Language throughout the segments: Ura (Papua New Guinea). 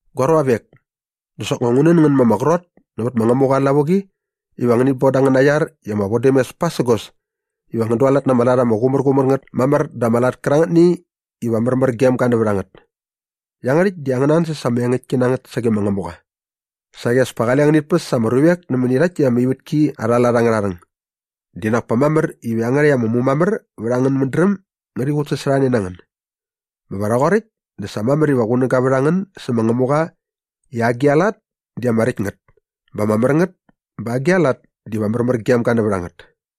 Gua ruavek, dä soknga ngu nän ngän ma ama qrot nävät ma Ngämuqa aa lavuqi iva ngänit bon da angäna iar i ama vodämes pasägos iva ngän dualat na ama lat ama qumärqumär ngät mamär dä ama lat kärangätni iva märmär gem ga nävät a ngät. Iangärhäkt di angäna ansäs ama engäktki na ngät sage ma Ngämuqa. Saqi as pa kale ngänit päs ama ruvek nämäni rhakt täkt ama ivätki arha lat angärha rhäng. Dap kinak pa mamär iva iangärhäkt ama mumamär vät angän mädräm ngärhi qutsasorhane na ngän. Bä va rhoqoräkt dä sa mamär iva qunäga vät a ngän sä ma Ngämuqa i agi a lat di ama räkt ngät bä ama mär ngät bä agi a lat diva märmärgem gem ga nävät a ngät.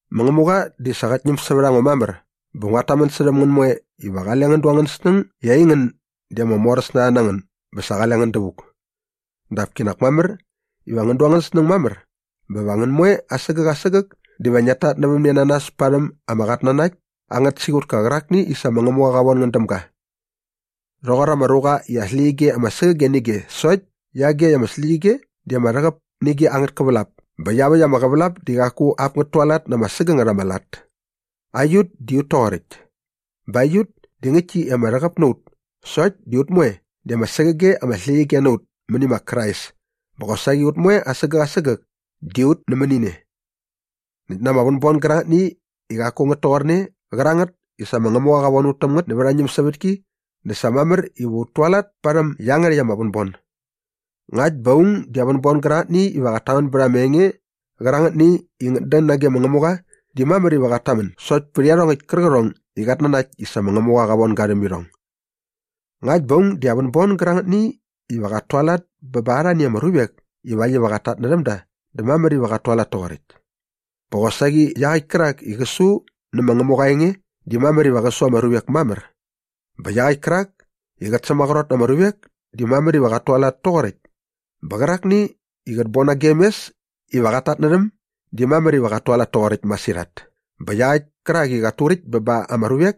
Ma Ngämuqa di sa qät ñäm sävät a ngo mamär bä nguat tamän särhäm ngän moe iva qale ngän du angän snäng i aingän di ama moräs na rha na ngän bä sa qale ngän dävuk. Dap kinak mamär iva ngän du angän snäng mamär bä va ngän moe asägäk asägäk diva ngiat tatnävämne na nas parhäm ama qatnanakt angät siqutka qärakni i sa ma Ngämuqa qa von ngän däm ga. Rhoqor ama ruqa i aa släqyige ama sägäge nä ige sokt di iagekt ama släqyige di ama rhäqäp nä ige angät kävälap bä iaväkt ama qävälap di qaku ap ngät tualat na ama sägängät ama lat. Aiut di ut toqoräkt. Bä aiut di ngäktki i ama rhäqäp na ut sokt di ut moe di ama sägäge ama släqyige na ut mäni ma Krais bä qosaqi ut moe asägäk asägäk di ut nämäni ne. Näkt na ama vänbon gärangätni i qaku ngät toqorne qärangät i sa ma Ngämuqa qa von ut täm ngät nävät aa ñämsävätki dä sa mamär iva ut tualat parhäm iangärhäkt ama vänbon. Ngakt bä aung di aa vänbon gärangätni iva qat tamän bät ama enge qärangätni i ngät dän nage ma Ngämuqa di mamär iva qat tamän sokt pät iarhongäkt kärqärhong i qat nanakt i sa ma Ngämuqa qa von ga rhäm irhong. Ngakt bä aung di aa vänbon gärangätni iva qat tualat bä ba arhani ama ruvek ivakt iva qat tatnärhäm da dä mamär iva qat tualat toqoräkt. Bä qosaqi iaqäkt kärak i qä su nä ma Ngämuqa aa enge di mamär iva qä su ama ruvek mamär. Bä iaqäkt kärak i qät sämaqrot na ama ruvek di mamär iva qat tualat toqoräkt bä qärakni i qät bon nagem mes iva qat tatnärhäm di mamär iva qat tualat toqoräkt masirhat bä iaqäkt kärak i qat turäkt bä ba ama ruvek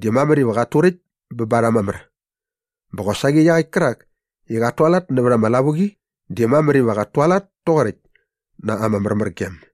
di mamär iva qat turäkt bä ba rha mamär. Bä qosaqi iaqäkt kärak i qat tualat nävät ama lavuqi di mamär iva qat tualat toqoräkt na ama märmärgem.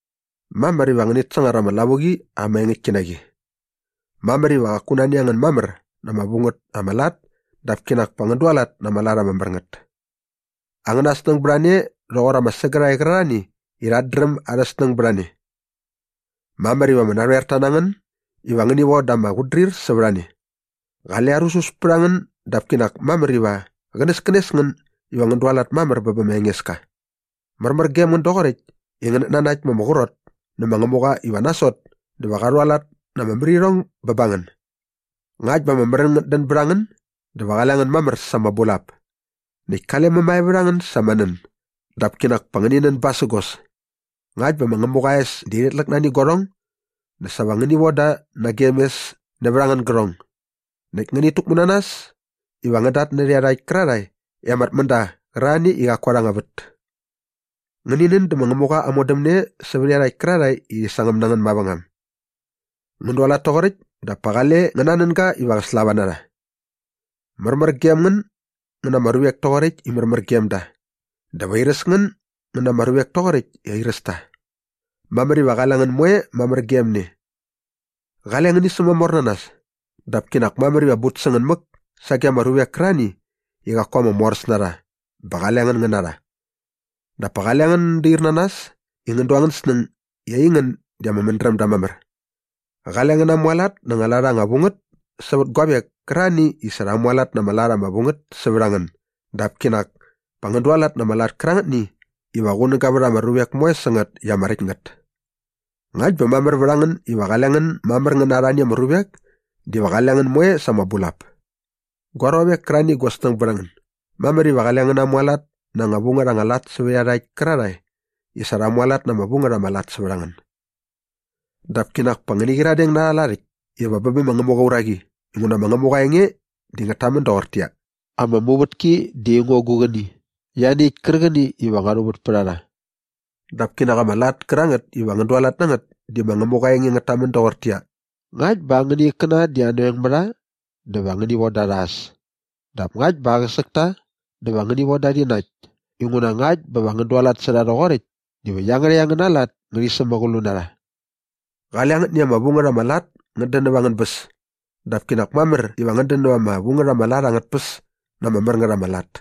Mamär iva ngänät sangar ama lavuqi ama engäktki na qi. Mamär iva qaku nani a ngän mamär na ama vu ngät ama lat dap kinak pa ngän dualat na ama lat ama mär ngät. Angäna snäng bät a ne rhoqor ama sägärhae qärarhani i rhat dräm arhä snäng bät a ne. Mamär iva ama narhoer ta na ngän iva ngäni von da ama qutdrir sävät a ne. Qale arusus pät a ngän dap kinak mamär iva qänäskänes ngän iva ngän dualat mamär bä bä ma Engeska. Märmär gem ngän doqoräkt i ngänät nanakt ma ama qrot nä ma Ngämuqa iva nasot dä va qa rhualat na ama märirhong bä ba ngän. Ngakt ba ama märän ngät dän bät a ngän dä va qale ngän mamär sa ama bulap. Näkt kale mämae vät a ngän sa ama nän dap kinak pa ngäni nän basägos. Ngakt bä ma Ngämuqa aa es di rhit läk nani guarhong dä sa va ngäni von da nagem mes nävät angän gärhong. Näkt ngänit täkmu na nas iva ngän datnärhä iarhakt kärarhae i ama tmända qärarhani i qaku arha anga vät. Ngäni nän dä ma Ngämuqa aa modämne sävät iarhakt kärarhae i rhi sangäm na ngän mavängam. Ngän dualat toqoräkt dap pa qale ngän nanän ga iva qä slava na rha. Märmär gem ngän ngän na ama ruvek toqoräkt i märmär gem da dä va airäs ngän ngän na ama ruvek toqoräkt i airäs ta. Mamär iva qale ngän moe mamär gem ne. Qale ngäni sämamor na nas dap kinak mamär iva but sä ngän mäk sage ama ruvek kärarhani i qaku ama moräs na rha bä qale ngän ngän na rha. Dap pa qale ngän dair na nas i ngän du angän snäng i aingän di ama mädrämda mamär. Qale ngän namualat na anga vu ngät anga lat sävät guavek kärarhani i sa rha mualat na anga lat anga vu ngät sävät a ngän dap kinak pa ngän dualat na ama lat kärangätni iva qunäga vät ama ruvek moe sä ngät i ama räkt ngät. Ngakt bä mamär vät a ngän iva qale ngän mamär ngän na arhani ama ruvek diva qale ngän moe sa ama bulap. Gua ruavek kärarhani i gua snäng bät a ngän, mamär iva qale ngän namuvät na anga vu ngät anga lat sävät iarhakt kärarhae i sa rha mualat na ama vu ngät ama lat sävät a ngän. Dap kinak pa ngäni qyiradeng na arha lat äkt iva bä bä ma Ngämuqa aa uraqi inguna ma Ngämuqa aa enge di ngät tamän doqortäqyia, “Ama muvätki di aingo gu qäni ianiäkt kärqäni iva ngua rhuvät pät a rha.” Dap kinak ama lat kärangät iva ngän dualat na ngät di ma Ngämuqa aa enge ngät tamän doqortäqyia, “Ngakt bä angäna ikkäna di anoeng mä rha dä va ngäni von da rha äs dap ngakt bä aqäsäk ta dä va ngäni von da rhi nakt inguna ngakt bä va ngän dualat sä rha rhoqoräkt diva iangärhäkt angäna lat ngärhi sämäqlu na rha.” Qale angätni ama vu ngät ama lat ngät dän näva angän bäs dap kinak mamär iva ngän dän näva ama vu ngät ama lat angät tpäs na ama mär ngät ama lat.